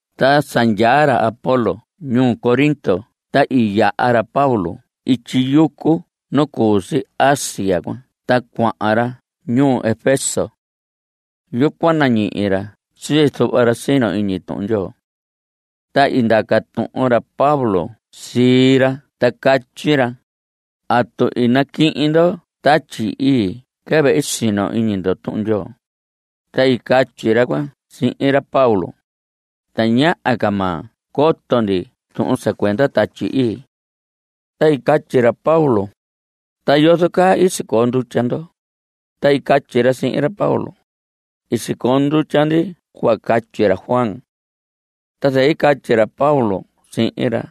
Ta sa ndyaa ra Apolos ñuu Corinto ta i yaha ra Pablo ityi yucu nu cu si Asia cuan ta cuahan ra ñuu Efeso. Yucuan nañihi ra sii zuhva ra sino iñi Tuhun Ndyoo. Ta i ndaca tuhun ra Pablo sii ra ta catyi ra: ¿Atu i naquihin ndo Tatyi Ii quɨvɨ i sino iñi ndo Tuhun Ndyoo? Ta i catyi ra cuan sihin ra Pablo: Tañaha ca ma coto ndi tuhun sa cuenda Tatyi Ii. Ta i catyi ra Pablo: ¿Ta yozo caa i sicoo ndutya ndo? Ta i catyi ra sihin ra Pablo: I sicoo ndutya ndi cuhva catyi ra Juan. Ta zɨquɨ i catyi ra Pablo sihin ra: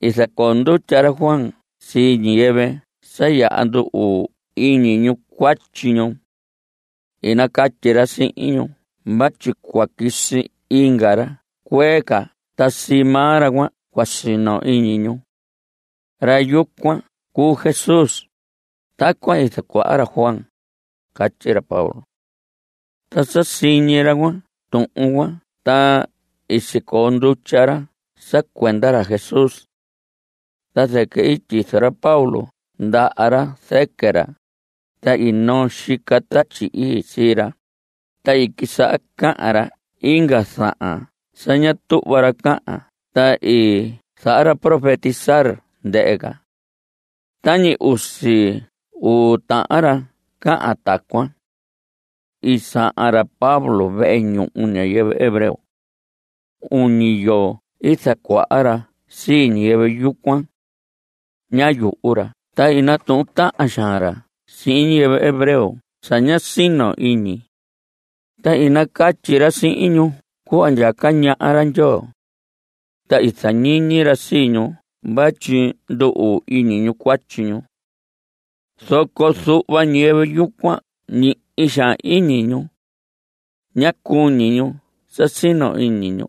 I zacoo ndutya ra Juan sii ñiyɨvɨ sa yaha ndu‑uu iñi ñu cuatyi ñu. I nacatyi ra sihin ñu vatyi cua quisi inga ra cuee ca ta sii maa ra cuan cua sino iñi ñu. Ra yucuan cuu Jesús. Tacuan i zacuaha ra Juan, catyi ra Pablo. Ta sa siñi ra cuan tuhun cuan ta i sicoo ndutya ra sa cuenda ra Jesús. Ta zɨquɨ i tyizo ra Pablo ndaha ra zɨquɨ ra, ta i noo xica Tatyi Ii sii ra, ta i quisaha cahan ra inga zahan sa ña tuhva ra cahan ta i zaha ra profetizar, ndɨhɨ ca. Tañi usi uu tahan ra cahan tacuan. I sahan ra Pablo vehe ñuhu ñiyɨvɨ hebreo. Uñi yoo i zacuaha ra sii ñiyɨvɨ yucuan. Ñá yuhu ra ta i natuhun tahan xaan ra sihin ñiyɨvɨ hebreo sa ña sino iñi. Ta i nacatyi ra sihin ñu cuhva ndyaca ñaha ra Ndyoo. Ta i zañiñi ra sii ñu vatyi ndu‑uu iñi ñu cuatyi ñu. Zoco zuhva ñiyɨvɨ yucuan ñihi xaan iñi ñu. Ñá cuñi ñu sa sino iñi ñu.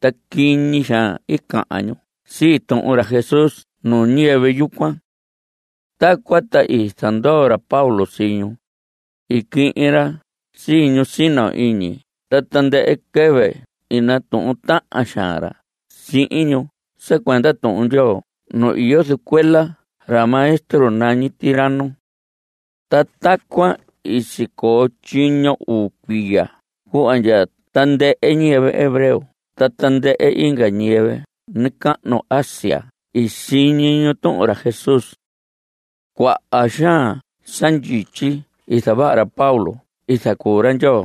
Ta quiñi xaan i cahan ñu sii tuhun ra Jesús nuu ñiyɨvɨ yucuan. Tacuan ta i zandoo ra Pablo sii ñu. I quihin ra sii ñu sino iñi, ta tandɨhɨ quɨvɨ i natuhun tahan xaan ra sihin ñu sa cuenda Tuhun Ndyoo nu iyo zɨcuela ra maestro nañi Tiranno. Ta tacuan i sicoo tyiño uu cuiya cuhva ndya tandɨhɨ ñiyɨvɨ hebreo ta tandɨhɨ inga ñiyɨvɨ nacahnu Asia i siñi ñu tuhun ra Jesús. Cuaha xaan sa ndyityi i zavaha ra Pablo i zacuu ra Ndyoo.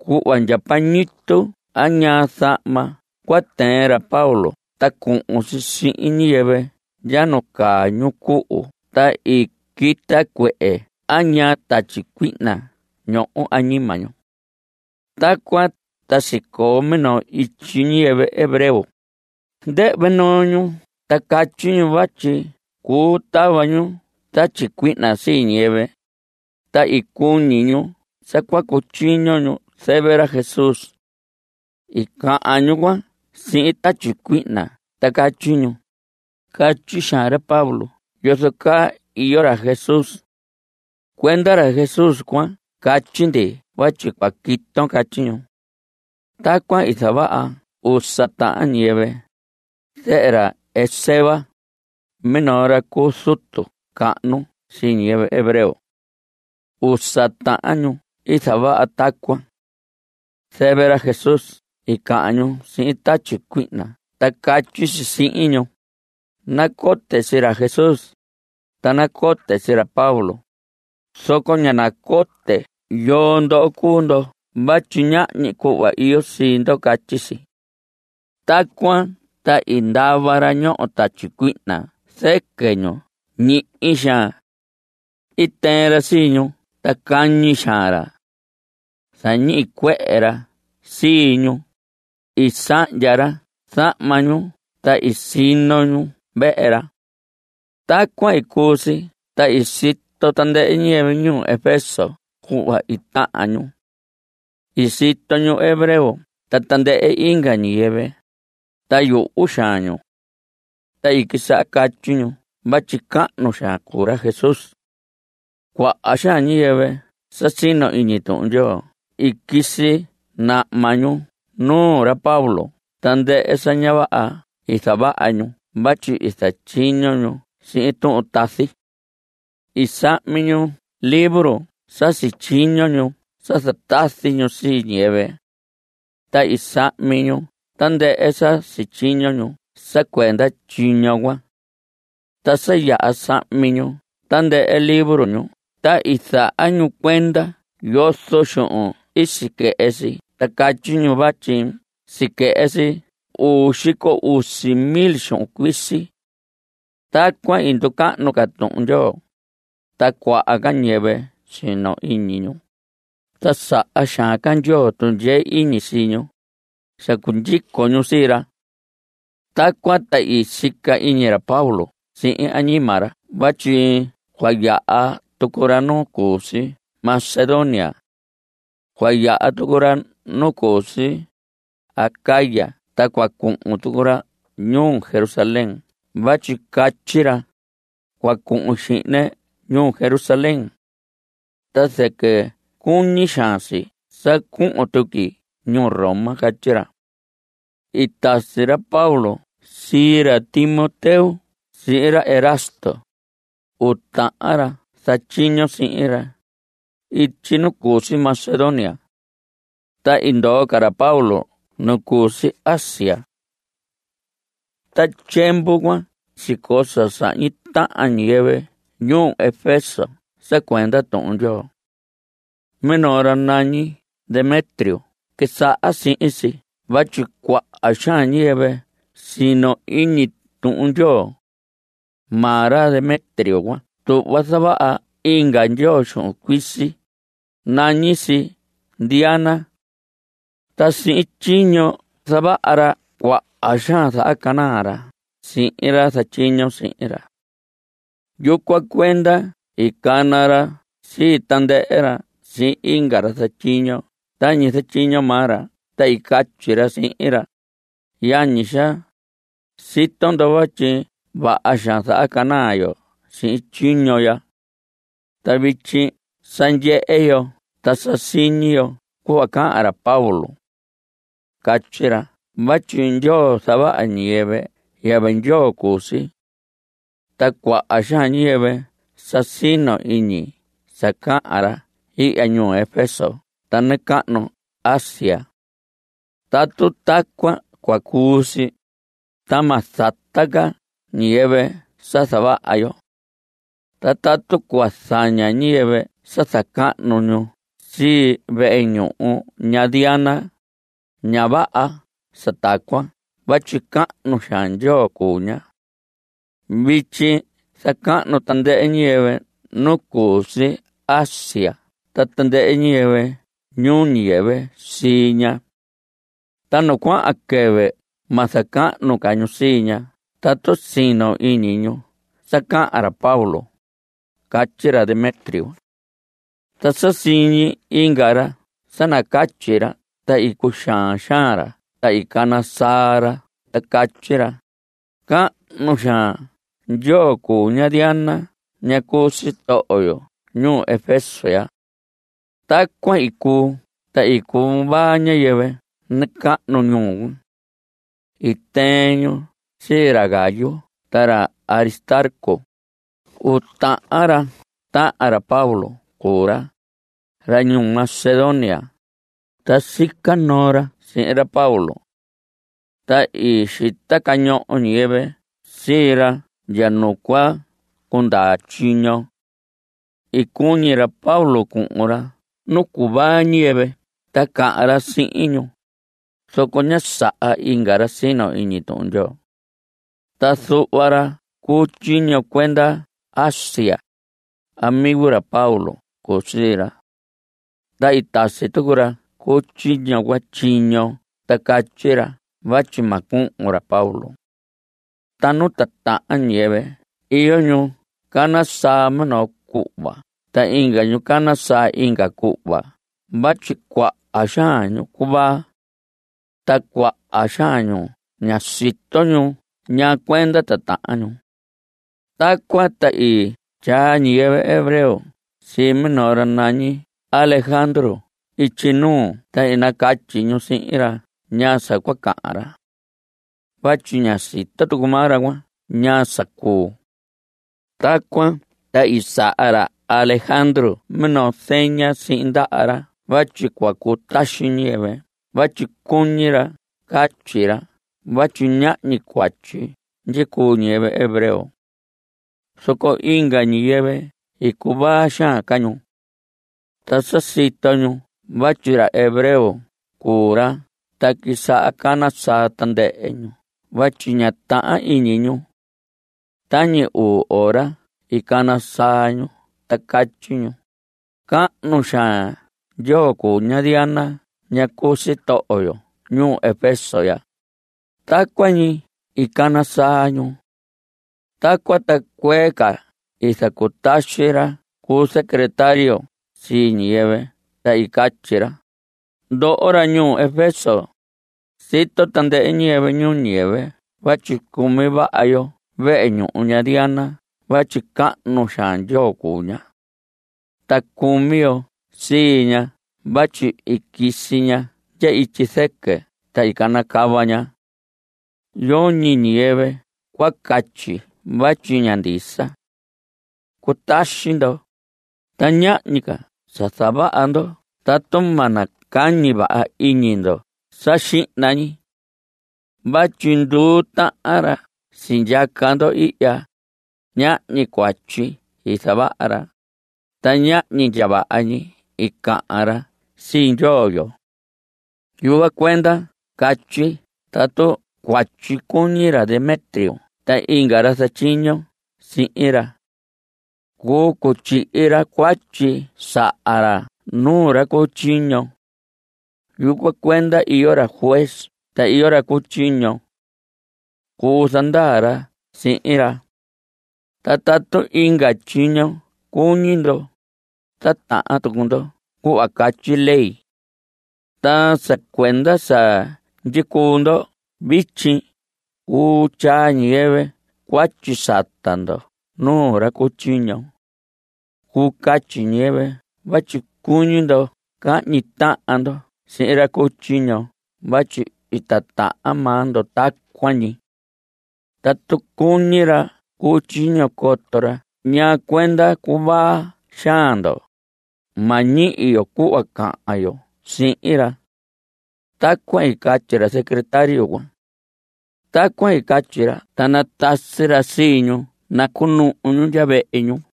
Cuhva ndya pañitu a ñaa zahma cua tɨɨn ra Pablo ta cuhun si sihin ñiyɨvɨ ndya nu caa ñu cuhu ta i quita cuehe a ñaa tatyi cuihna ñoho añima ñu. Tacuan ta sicoo minoo ityi ñiyɨvɨ hebreo. Ndɨhvɨ noo ñu ta catyi ñu vatyi cuu tava ñu tatyi cuihna sii ñiyɨvɨ, ta i cuñi ñu sa cua cutyiño ñu zɨvɨ ra Jesús. I cahan ñu cuan sihin tatyi cuihna ta catyi ñu: Catyi xaan ra Pablo yozo caa iyo ra Jesús. Cuenda ra Jesús cuan catyi ndi vatyi cua quiton. Catyi ñu. Tacuan i zavaha usa tahan ñiyɨvɨ, zehe ra Esceva, minoo ra cu zutu cahnu sii ñiyɨvɨ hebreo. Usa tahan ñu i zavaha tacuan. Zɨvɨ ra Jesús i cahan ñu sihin tatyi cuihna ta catyi si sihin ñu: Nacote sii ra Jesús. Ta nacote sii ra Pablo, zoco ña nacote yoo ndoho cuu ndo vatyi ñahñi cuhva iyo sii ndo. Catyi si. Tacuan ta i ndava ra ñoho tatyi cuihna zɨquɨ ñu ñihi xaan. I tɨɨn ra sii ñu ta cañi xaan ra. Zañicuehe ra sii ñu. I sahndya ra zahma ñu ta i sino ñu vehe ra. Tacuan i cuu si ta i sito tandɨhɨ ñiyɨvɨ ñuu Efeso cuhva i tahan ñu. I sito ñu hebreo ta tandɨhɨ inga ñiyɨvɨ. Ta yuhu xaan ñu. Ta i quisaha catyi ñu vatyi cahnu xaan cuu ra Jesús. Cuaha xaan ñiyɨvɨ sa sino iñi Tuhun Ndyoo i quisi nahma ñu nuu ra Pablo tandɨhɨ sa ña vaha i zavaha ñu vatyi i zatyiño ñu sihin tuhun tazi. I sahmi ñu libro sa sityiño ñu sa zatazi ñu sii ñiyɨvɨ. Ta i sahmi ñu tandɨhɨ sa sityiño ñu sa cuenda tyiño cuan. Ta sa yaha sahmi ñu tandɨhɨ libro ñu ta i zaha ñu cuenda yozo xuhun i siquɨhɨ si ta catyi ñu vatyi siquɨhɨ si uu xico usi mil xuhun cuisi. Tacuan i nducahnu ca Tuhun Ndyoo, ta cuaha ca ñiyɨvɨ sino iñi ñu, ta saha xaan ca Ndyoo tundyee iñi sii ñu (sa cundyico ñu sii ra). Tacuan ta i sica iñi ra Pablo sihin añima ra vatyi cua yaha tucu ra nu cu si Macedonia. Cua yaha tucu ra nu cu si Acaya, ta cua cuhun tucu ra ñuu Jerusalén vatyi catyi ra: Cua cuhun xihne ñuu Jerusalén. Ta zɨquɨ cuñi xaan si sa cuhun tuqui ñuu Roma. Catyi ra. I tasi ra Pablo sii ra Timoteo sihin ra Erasto, uu tahan ra zatyiño sihin ra, ityi nu cu si Macedonia. Ta i ndoo ca ra Pablo nu cu si Asia. Ta tyiemvu cuan sicoo sa sahñi tahan ñiyɨvɨ ñuu Efeso sa cuenda Tuhun Ndyoo. Minoo ra nañi Demetrio quisaha sihin si vatyi cuaha xaan ñiyɨvɨ sino iñi Tuhun Ndyoo. Maa ra Demetrio cuan tuhva zavaha inga ndyoo xuhun cuisi, nañi si Diana. Ta sihin tyiño zavaha ra cuaha xaan zahacanaa ra sihin ra zatyiño sihin ra. Yucuan cuenda i cana ra sii tandɨhɨ ra sihin inga ra zatyiño tañi zatyiño maa ra ta i catyi ra sihin ra: Yañi xaa, sito ndo vatyi vaha xaan zahacanaa yo sihin tyiño ya. Ta vityi sa ndyehe yo ta sa siñi yo cuhva cahan ra Pablo. Catyi ra vatyi ndyoo zavaha ñiyɨvɨ yɨvɨ ndyoo cuu si. Ta cuaha xaan ñiyɨvɨ sa sino iñi sa cahan ra ihya ñuu Efeso ta nacahnu Asia. Tatu tacuan cua cuu si, ta ma zata ca ñiyɨvɨ sa zavaha yo. Ta tatu cua zaña ñiyɨvɨ sa zacahnu ñu sii vehe ñuhu ña Diana, ña vaha sa tacuan vatyi cahnu xaan ndyoo cuu ña. Vityi zacahnu tandɨhɨ ñiyɨvɨ nu cu si Asia ta tandɨhɨ ñiyɨvɨ ñuu ñiyɨvɨ sii ña. Ta nu cuahan quɨvɨ ma zacahnu ca ñu sii ña tatu sino iñi ñu sa cahan ra Pablo. Catyi ra Demetrio. Ta sa siñi inga ra sa nacatyi ra ta i cuxaan xaan ra ta i cana saa ra ta catyi ra: Cahnu xaan ndyoo cuu ña Diana ña cu sitoho yo ñuu Efeso ya. Tacuan i cuu ta i cuvaa ñiyɨvɨ nacahnu ñuu cuan. I tɨɨn ñu sii ra Gayo ta ra Aristarco. Uu tahan ra tahan ra Pablo cuu ra, ra ñuu Macedonia, ta sica noo ra sihin ra Pablo. Ta i xita cañoho ñiyɨvɨ sii ra ndya nu cua cundaa tyiño. I cuñi ra Pablo cuhun ra nu cuvaa ñiyɨvɨ ta cahan ra sihin ñu, zoco ñá saha inga ra sino iñi Tuhun Ndyoo. Ta zuhva ra cu tyiño cuenda Asia, amigo ra Pablo cuu sii ra. Ta i tasi tucu ra cu tyiño cuan tyiño ta catyi ra vatyi ma cuhun ra Pablo. Ta nu titahan ñiyɨvɨ iyo ñu cana saa minoo cuhva ta inga ñu cana saa inga cuhva vatyi cuaha xaan ñu cuvaa. Ta cuaha xaan ñu ñá sito ñu ñaa cuenda titahan ñu. Tacuan ta i tyaa ñiyɨvɨ hebreo sii minoo ra nañi Alejandro ityi nuu, ta i nacatyi ñu sihin ra ñaa sa cua cahan ra. Vatyi ñá sito tucu maa ra cuan ñaa sa cuu. Tacuan ta i saha ra Alejandro minoo zeña sihin ndaha ra vatyi cua cutaxi ñiyɨvɨ vatyi cuñi ra catyi ra vatyi ñahñi cuatyi ndyicuu ñiyɨvɨ hebreo. Zoco inga ñiyɨvɨ i cuvaa xaan ca ñu. Ta sa sito ñu vatyi ra hebreo cuu ra ta quisaha cana saa tandɨhɨ ñu vatyi ñá tahan iñi ñu. Tañi uu ora i cana saa ñu ta catyi ñu: ¡Cahnu xaan ndyoo cuu ña Diana ña cu sitoho yo ñuu Efeso ya! Tacuan ñi i cana saa ñu. Tacuan ta cuee ca i zacutaxi ra cu secretario sii ñiyɨvɨ ta i catyi ra: Ndoho ra ñuu Efeso, sito tandɨhɨ ñiyɨvɨ ñuu ñiyɨvɨ vatyi cumi vaha yo vehe ñuhu ña Diana vatyi cahnu xaan ndyoo cuu ña. Ta cumi yo sii ña vatyi i quisi ña ndya ityi zɨquɨ ta i canacava ña. Yoñi ñiyɨvɨ cua catyi vatyi ña ndisa. Cutaxi ndo. Ta ñahñi ca sa zavaha ndo tatu ma nacañi vaha iñi ndo sa xihna ñi. Vatyi nduu tahan ra sindyaca ndo ihya, ñahñi cuatyi i zavaha ra, ta ñahñi ndya vaha ñi i cahan ra sii ndyoo yo. Yucuan cuenda catyi tatu cuatyi cuñi ra Demetrio ta inga ra zatyiño sihin ra. Cuu cutyihi ra cuatyi saha ra nuu ra cu tyiño. Yucuan cuenda iyo ra juez ta iyo ra cu tyiño. Cuu zandaa ra sihin ra. Ta tatu inga tyiño cuñi ndo. Titahan tucu ndo cuhva catyi ley. Ta sa cuenda sa ndyicuu ndo vityi cuu tyaa ñiyɨvɨ cuatyi sata ndo nuu ra cu tyiño. Cuu catyi ñiyɨvɨ vatyi cuñi ndo cahñi tahan ndo sihin ra cu tyiño vatyi i titahan maa ndo tacuan ñi. Tatu cuñi ra cu tyiño coto ra ñaa cuenda cuvaa xaan ndo, ma ñihi yo cuhva cahan yo sihin ra. Tacuan i catyi ra secretario cuan. Tacuan i catyi ra ta natasi ra sii ñu nacunuhu ñu ndya vehe ñu.